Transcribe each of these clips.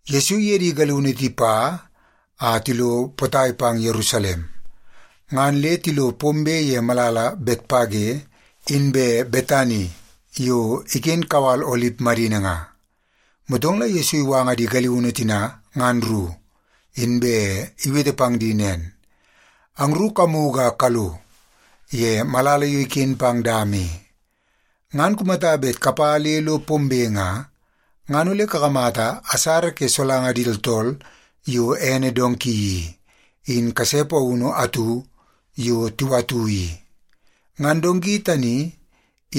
Yesu iye di galiunu tipa a tilo potai pang Yerusalem, ngan le tilo pombe ye malala Betpage inbe Betani yo iken kawal Olip madini nga. Motong la Yesu iwanga di galiunu tina ngan ru, inbe iwete pang di nen, “Angru kamugu a kalo ye malala yo iken pang dama i. Ngan kumata bet kapa le lo pombe nga, ngan ole kakamata asara ke solanga di tooltool yo ene donki i, in kase paunu atu yo tiwatu i. Ngan donki tani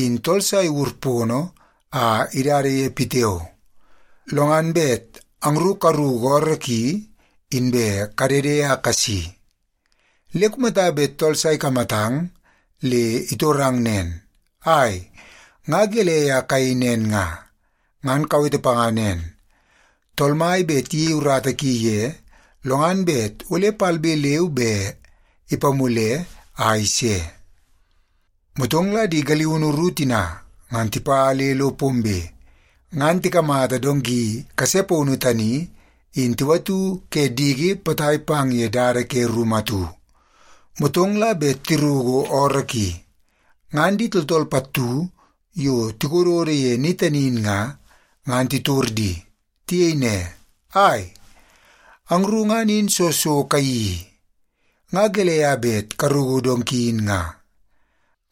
in tool sa iwur pono a idada ye pitiao. Lo ngan bet angru karuku ooroo ki, inbe kadede a kasi. Le kumata bet tool sa ikamatang le itorang nen, ‘Ai, nga gelei a kayei nen nga?’ ngan kawete panga nen, ‘Tool Mai bet iyei urata ki ye, lo ngan bet ole palbe leu be ipamule a ise.’” Motong la di galiunu ru tina ngan tipa le lo pombe, ngan tikamata donki kase paunu tani in tiwatu ke diki potai pang ye dada ke rumu atu. Motong la bet tiruku ooroo ki, ngan di tooltool pattu yo tikododo ye ni tani in nga, ngan titor di. Tiyei ne, “Ai, angru ngan in soo so kayeii i? Nga gelei a bet karuku donki in nga?”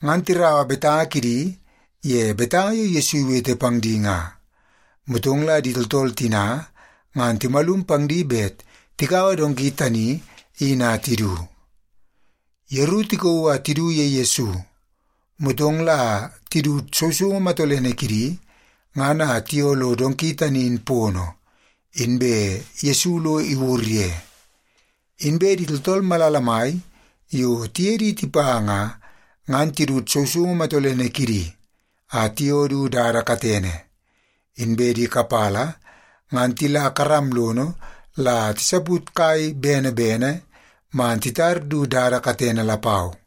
Ngan tiraua betanga kidi ye betanga yo Yesu iwete pang di nga. Motong la di tooltool tina ngan timalum pang di bet tikaua donki tani in a tidu. Yeru tikauu a tidu ye Yesu, motong la tidut sousoungu matolene kidi ngan a tiyoo lo donki tani in pono, inbe Yesu lo iwur ye. Inbe di tooltool malala mai yo tiye di tipa nga, ngan tidut sousoungu matolene kidi a tiyoo du dada katene, inbe di kapala ngan tila karam lono la tisaput kai bene bene man titar du dada katene lapau.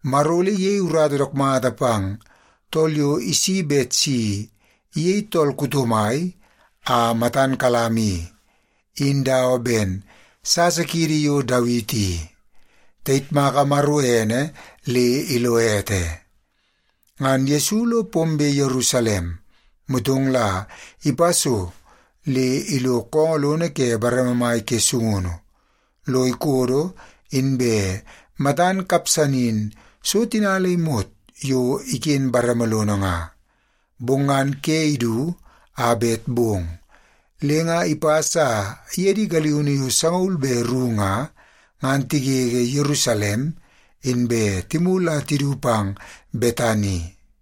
Maro ole iyei urata dook mata pang tool yo isi bet si iyei tool kuto mai a matan kalam i, in dawa ben sasa kiidi yo Dawiti i. Tayitmaka Maro ene le ilo ete!” Ngan Yesu lo pombe Yerusalem, motong la ipa so le ilo koongoo lono ke bareme mai ke sungunu lo ikodo inbe matan kapsanin so tina le imot yo iken bareme lono nga. Bong ngan ke idu a bet bong, le nga ipas a iye di galiunu yo sangaul be ru nga, ngan tigege Yerusalem inbe timulu a tidu pang Betani.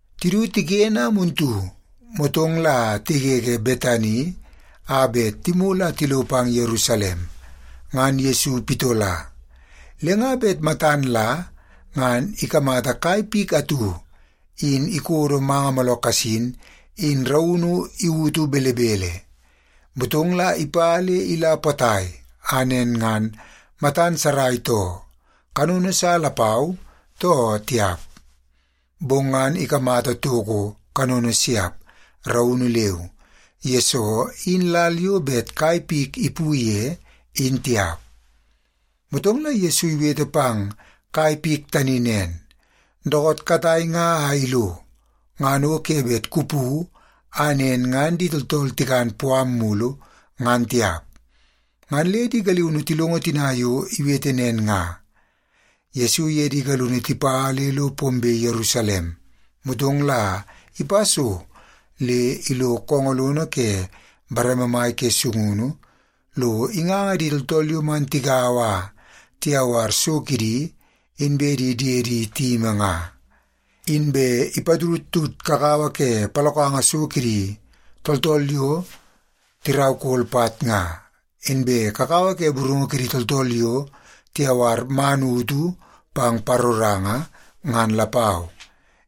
Tidu tiken a muntu, motong la tigege Betani a bet timulu a tilo pang Yerusalem, ngan Yesu pitola. Le nga bet matan la ngan ikamata kai pik atu in ikodo manga mooloo kasin in raunu iwutu belebele. Motong la ipa le ila potai a nen ngan matan sarai too, kanono sa lapau, too tiap. Bong ngan ikamata toko kanono siap, raunu leu, yesoo in lal yo bet kai pik ipu ye, in tiap. Motong la Yesu iwete pang kai pik tani nen, “Dookoot katai nga a ilo, ngan o ke bet kupu a nen ngan di tooltool tikan puam mulu, ngan tiap.” Ngan le di galiunu tilongo tina yo iwete nen nga. Yesu iye di galiunu tipa le lo pombe Yerusalem, motong la ipa so le ilo koongoo lono ke bareme mai ke sungunu lo inganga di tooltool yo man tigaua a tiyawar so kidi inbe di diedi tiyimi nga. Inbe ipatudtud kakawa ke palokanga so kidi tooltool yo tiraukol pat nga, inbe kakawa ke burungu kidi tooltool yo tiyawar man utu pang paroranga, ngan lapau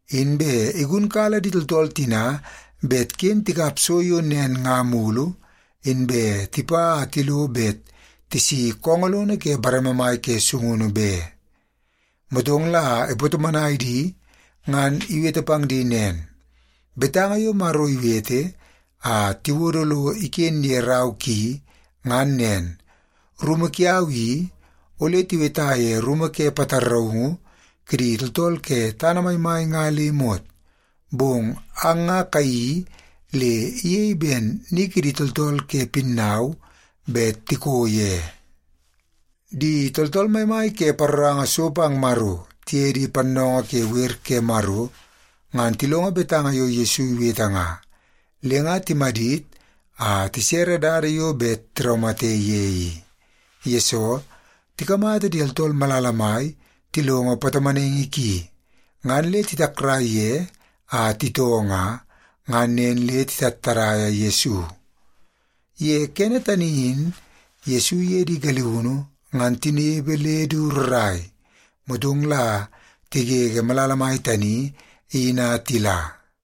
Inbe igunkala di tooltool tina bet ken tikap so yo nen nga mulu inbe tipa a tilo bet tisi koongoo lono ke bareme mai ke sungunu be. Motong la ipatomonai di ngan iwete pang di nen, “Betanga yo Maro iwete a tiwodo lo iken ye rau ki ngan nen, ‘Rumu kiau i, ole tiweta ye rumu ke pataraungu kidi tooltool ke tana maimai nga le imot.’ Bong ang nga kayeii le iyei ben ‘ni kidi tooltool ke pinnau bet tiko ye.’” Di tooltool maimai ke paroranga so pang Maro, tiye di pannoongoo ke wer ke Maro ngan tilongo betanga yo Yesu iwete nga, le nga timadit a tisere dada yo bet tiraumate ye i. Yesoo, tikamata di tooltool malala mai tilongo patomonaingi ki, ngan le titakrai ye a titoo nga, ngan nen le titattadaia Yesu. Ye kene tani in Yesu iye di galiunu ngan tinepe le du rrai, motong la tigege malala mai tani in a tila.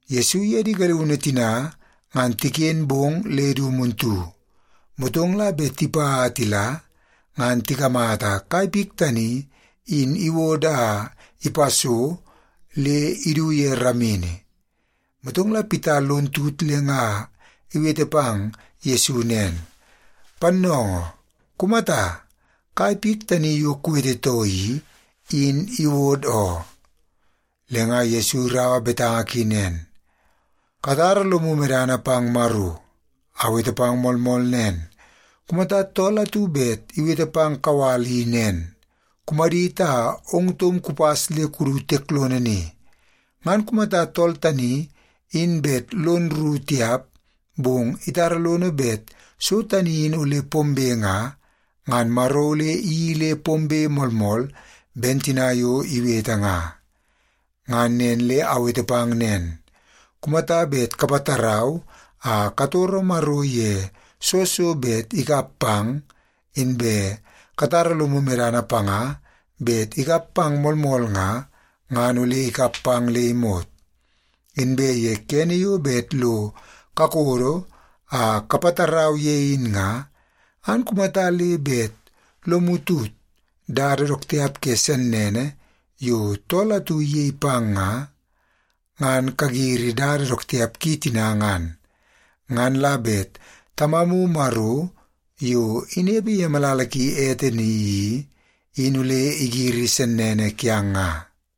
Yesu iye di galiunu tina ngan tiken bong le du muntu, motong la bet tipa a tila, ngan tikamata kai pik tani in iwod a ipa so le idu ye ramini. Motong la Pita lon tut le nga iwete pang Yesu nen, “Pannoongoo, kumata! Kai pik tani yo kuwetetoo i, in iwod oo.” Le nga Yesu iraua betanga ki nen, “Katara lomu medana pang Maro. Awete pang moolmool nen, kumata tool atu bet iwete pang kawal i nen, ‘Kumadit a ong taum kupas le kudu tiek lono ni,’ ngan kumata tool tani in bet lono rru tiap, bong itara lono medana bet so tani in ole pombe nga, ngan Maro ole iyeii le pombe moolmool ben tina yo iwete nga. Ngan nen le awete pang nen, kumata bet kapatarau a katoro Maro ye soo so bet ikap pang, inbe katara lomu medana panga bet ikap pang moolmool nga, ngan ole ikap pang le imot. Inbe ye kene yo bet lo kakodo a kapatarau ye in nga, ngan kumata le bet lomu tut dada dook tiap ke sennene yo tool atu iyei pang nga, ngan kagiri dada dook tiap ki tina ngan. Ngan la bet Tamamu Maro yo inepe ye malala ki ete i, in ole igiri sennene kiang nga.”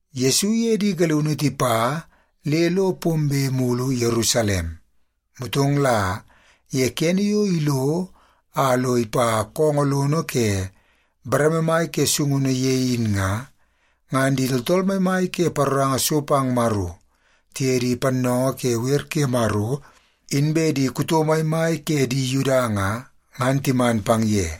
Yesu iye di galiunu tipa le lo pombe mulu Yerusalem, motong la ye kene yo ilo a lo ipa koongoo lono ke bareme mai ke sungunu ye in nga, ngan di tooltool maimai ke paroranga so pang Maro, tiye di pannoongoo ke wer ke Maro, inbe di kuto maimai ke di Yuda nga, ngan timan pang ye.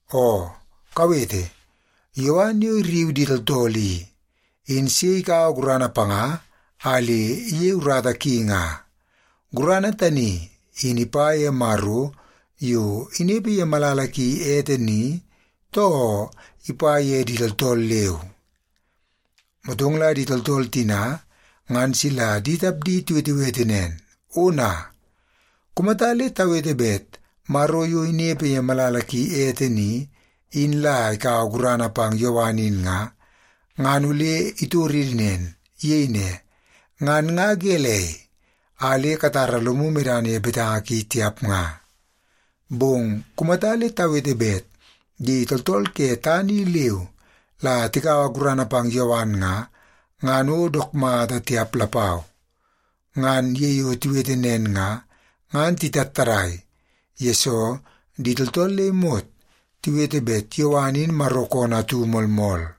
Oo, kawete! Yowan yo irriu di tooltool i, in sei ikaua gurana panga a le iyei urata ki nga? Gurana tani in ipa ye Maro yo inepe ye malala ki ete ni, too ipa ye di tooltool leu?” Motong la di tooltool tina ngan sila di tapdi tiwetewete nen, “Ona! Kumata le tawete bet Maro yo inepe ye malala ki ete ni, in la ikaua gurana pang Yowan in nga, ngan ole itoridi nen. Iyei ne, ‘Ngan nga gelei a le katara lomu medana ye betanga ki tiap nga?’ Bong kumata le tawete bet di tooltool ke tana i leu la tikaua gurana pang Yowan nga, ngan o dook mata tiap lapau.” Ngan ye yo tiwete nen nga, ngan titattadai, yesoo di tooltool le imot tiwete bet Yowan in Maro koonoo atu moolmool.